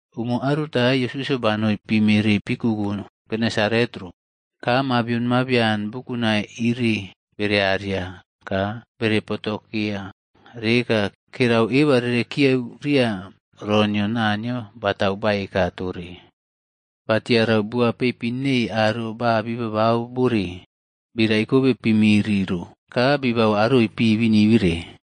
Umo aruta, Yesusꞌyo banou pi miri pi kuku Genesareta ro, ka mabion mabian bukunai iriꞌbearia ka bere potokea reka kerau eba rere kiyeu ria ro nio Naniyo batau baeka tore. Ba tiarau buwa peipin nei aro ba bii babau bore, bii raikobe pi miri ro ka bibau aroi pi binibire.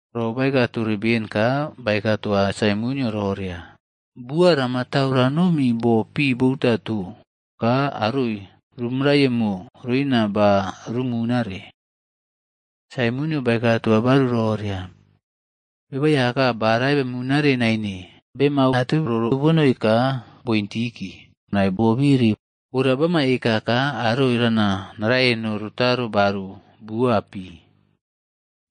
Ro baeka tore beni ka baeka toa Saimonꞌyo roria, “Buwa rama tau ranomi bo pi bo utato ka aroi ruꞌmarayemo roina ba rumunaꞌre.” Saimonꞌyo baeka toa baru roria, “Beba Aiyaka, ba rae bemunare naine bemau ateu roro bonoi ka bointiki nai bobiri. Ora bama eka ka aroi rana narayeno rotaro baru bua pi.”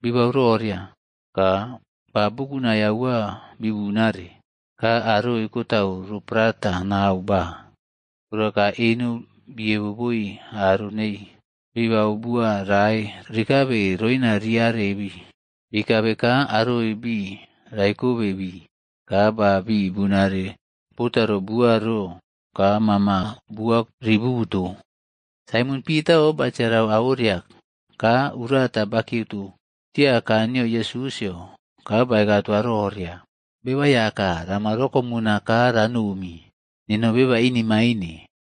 Bibau roria, ka ba bukunai aua bibunare, ka aroi kotau ro prata nau ba. Ora ka eno biebo boi aro nei bibau buwa rae rikabe roina rii arebii. Bii kabe ka aroi bii raikobe bii, ka ba bii bunare botaro buwa ro ka mama buwa rii bubuto. Saimon Pitaꞌo batiarau au oria, ka urata bakiyeuto tia kaa nio Yesusꞌyo ka baeka toa roria, “Beba Aiyaka, rama rokomuna ka ranomi, neno beba inimaine.”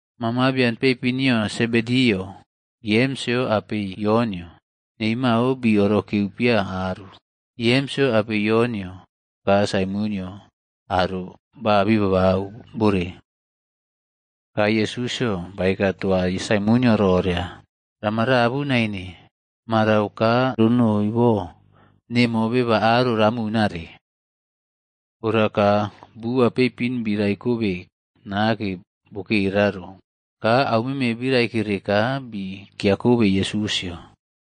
Ma mabian peipin nio Sebediꞌyo, Yemsꞌyo apei Yonꞌyo, nei mao bii orokeu pia aru. Yemsꞌyo apei Yonꞌyo ka Saimonꞌyo aro ba bibau bore. Ka Yesusꞌyo baeka toa Saimonꞌyo roria, “Rama rabu naine. Marau ka ronoi bo, nemo beba aro ramunare.” Ora ka buwa peipin bii raikobe nake bokera ro, ka au meme bii raikere ka bii kiakobe Yesusꞌyo.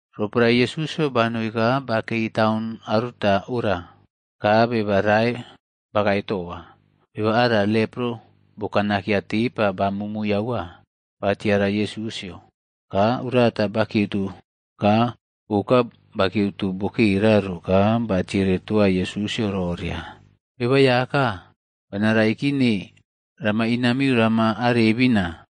Roporae Yesusꞌyo banoi ka bakei taun aruta ora, ka beba rae bakae toa. Beba ara lepro bokanakeya tepa ba mumui aua. Ba tiara Yesusꞌyo, ka urata bakiyeuto ka oka bakiyeuto bokera ro ka batiere toa Yesusꞌyo roria, “Beba Aiyaka, bana raikine, rama inamiu rama arebina,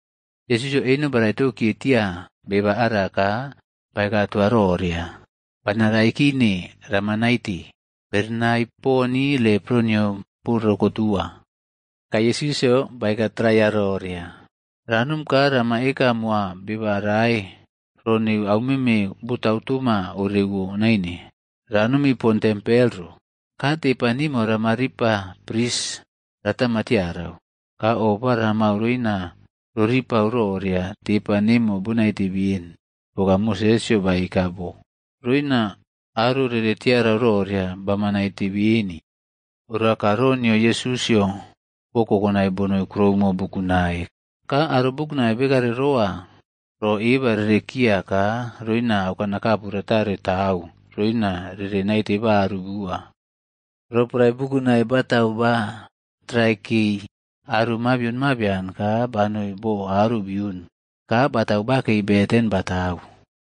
Yesusꞌyo eno ba raitou kiye tiaya beba ara ka baeka toa roria, “Bana raikine. Rama naite.” Berenai poni lepro nio bo rokotuwa. Ka Yesusꞌyo baeka traiya roria, “Ranom ka rama eka moa beba rae ro neu au meme botau toma ereriawo naine. Ranomi pon tempel ro, ka tepa nimo rama ripa pris ratama tiarau, ka ofa ramau roina roripau roria tepa nemo bonaite beni, poka Mosesꞌyo baeka bo. Roina aro rere tiarau roria, bama naite beni.” Ora ka ro nio Yesusꞌyo bo kokonai bonoi kuroumo bukunai. Ka aro bukunai bekare rowa ro eba rerekiya ka roina aukanakapu ratare tau roina rere naite baru bua. Roporae bukunai batau ba traikei aro mabion mabian ka banoi bo aro biun ka batau bakei beten batau.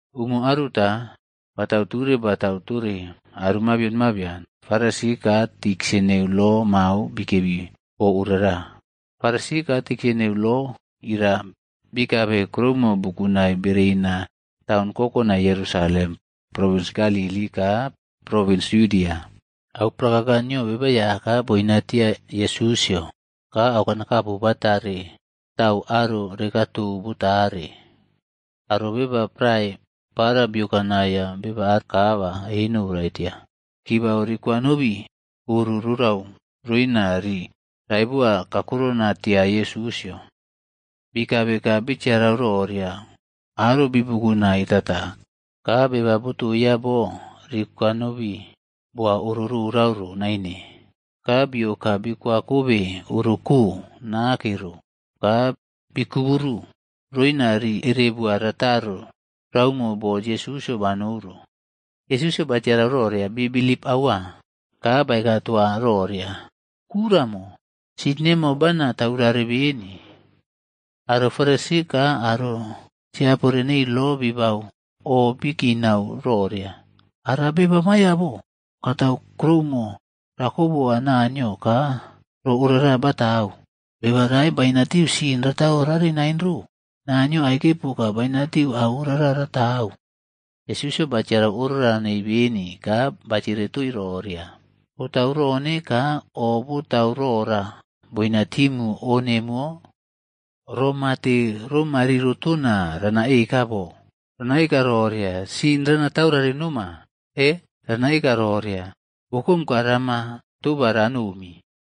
Umo aruta, batau ture batau tore aro mabion mabian, Farisi ka tiksa neu lo mao bikebi bo orara. Farisi ka tiksa neu lo irara bikabe kuroumo bukunai bereina taun kokonai Yerusalem, provins Galili ka provins Yudia. Au Prakaka nio Beba Aiyaka boinatia Yesusꞌyo ka aukanakapu batare tau aro rekaꞌtou botaree. Aro beba prae para biokau naiya beba kaa ba eno boꞌraitiya, kibau rikwanobi oro rorau roina rii raibowa kakurona tia Yesusꞌyo. Bii kabe ka bitiarau roria aro bibukunai tata ka beba botoiya bo rikwanobi boa oro rorauro naine. Ka bioka bikwakobe oroꞌko nake ro ka bikuburu roina rii erebo rataro raumo bo Yesusꞌyo banou ro. Yesusꞌyo batiarau roria bii bilip aua, ka baeka toa roria, “Kuraꞌmo, sin nemo bana taurare beni.” Aro Farisi ka aro tiapore nei lo bibau o bii kinau roria, “Ara beba maiyo bo katau kuroumo rako boa Naniyo ka ro orara batau? Beba rai bainatiu sin rataurare nain ro. Naniyo aike poka bainatiu au orara ratau.” Yesusꞌyo batiarau o rorau nei beni ka batiere toii roria, “Botau rone ka o botau rora boina timu o nemuwo? Ro mate ro mariro tona rana eka bo? Rana eka roria, ‘Sin rana taurare noma,’ e, rana eka roria, ‘Wokome ka rama toba ranomi?’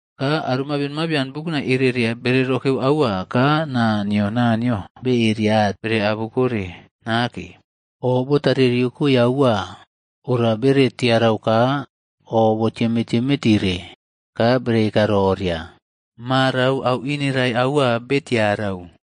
Ka aro bukunai mabion mabian ereria bere rokeu aua ka naa nio Naniyo beria bere abukoe nake. O botare riokoe au ora bere tiarau ka o bo tiemeꞌtieme tire ka bere eka roria, “Marau au inerai aua bee tiarau!”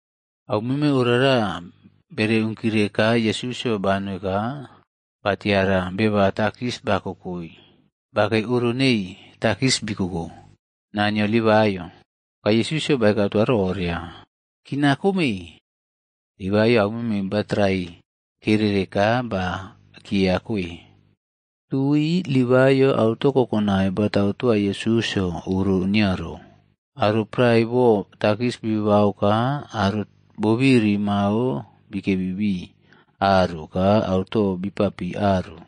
Au meme orara bere unkire ka Yesusꞌyo banoi ka batiara beba takis bakokoi bakei oro nei takis bikoko. Naa nio Livaiꞌyo.d Ka Yesusꞌyo baeka toa roria, “Kinaꞌkome.” Livaiꞌyo au meme batrai keree ka ba kiya koe. Tui Livaiꞌyo auto kokonai batau toa Yesusꞌyo oro nio ro. Aro prae boo takis bibau ka aro bobiri mao bikebi bii aru ka auto bipapii aru.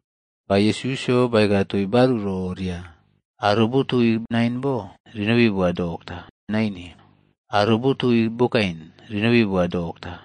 Ka Yesusꞌyo baeka toii baru roria, “Aro botooi nain bo rinobi boa dokta naine. Aro botooi bokain rinobi boa dokta.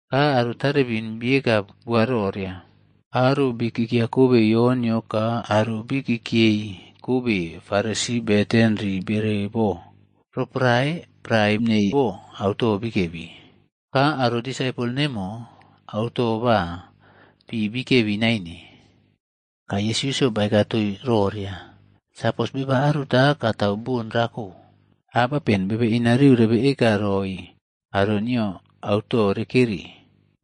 Ka aro tarebin bieka bua roria, “Aro bii kiꞌkiakobe Yonꞌyo ka aro bii kiꞌkiyei kobe Faresi beten rii bere bo, roporae prae neii bo auto bikebi. Ka aro disaipol nemo auto ba pi bikebi naine.” Ka Yesusꞌyo baeka toii roria, “Sapos beba aruta katau bon rako, abapen bebe inariu rebe eka roi aro nio auto rekeri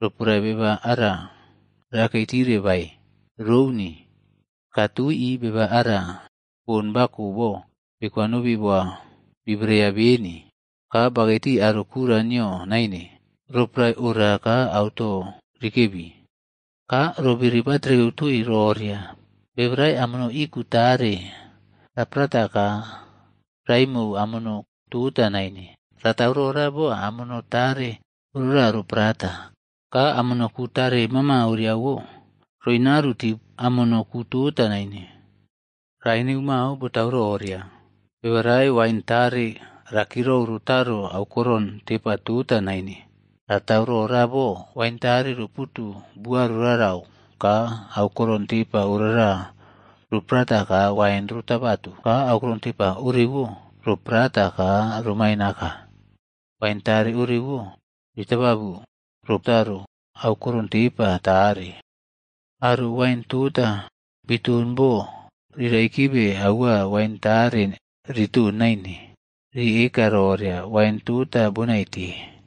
roporae beba ara rakei tire bae? Rouni. Ka tui, beba ara bon bako bo bikwanobi boa bii bereya beni, ka bakei tii aro kura nio naine, roporae ora ka auto rikebi.” Ka ro biri ba trekeu toii roria, “Beba rae amono ii ku tare raparata ka raꞌimou amono tota naine. Ratau rora bo amono tare orara roprata, ka amono ku tare mama orarawo roinaꞌaru tiu amono ku tota naine. Rae neu mao botau roria, beba rae wain tare ra kirou rotaro aukoron tepa tota nain. f Ra tau rora bo, wain tare roputu buaꞌrorarau ka aukoron tepa orara roprata ka wain ro tabatu, ka aukoron tepa orewo ro prata ka romain aka. Wain tare orewo, ritababu rotaro aukoron tepa tare. Aro wain tota biton bo rii raikibe aua wain tare rii ton naine, rii eka roria, ‘Wain tota bonaite.’”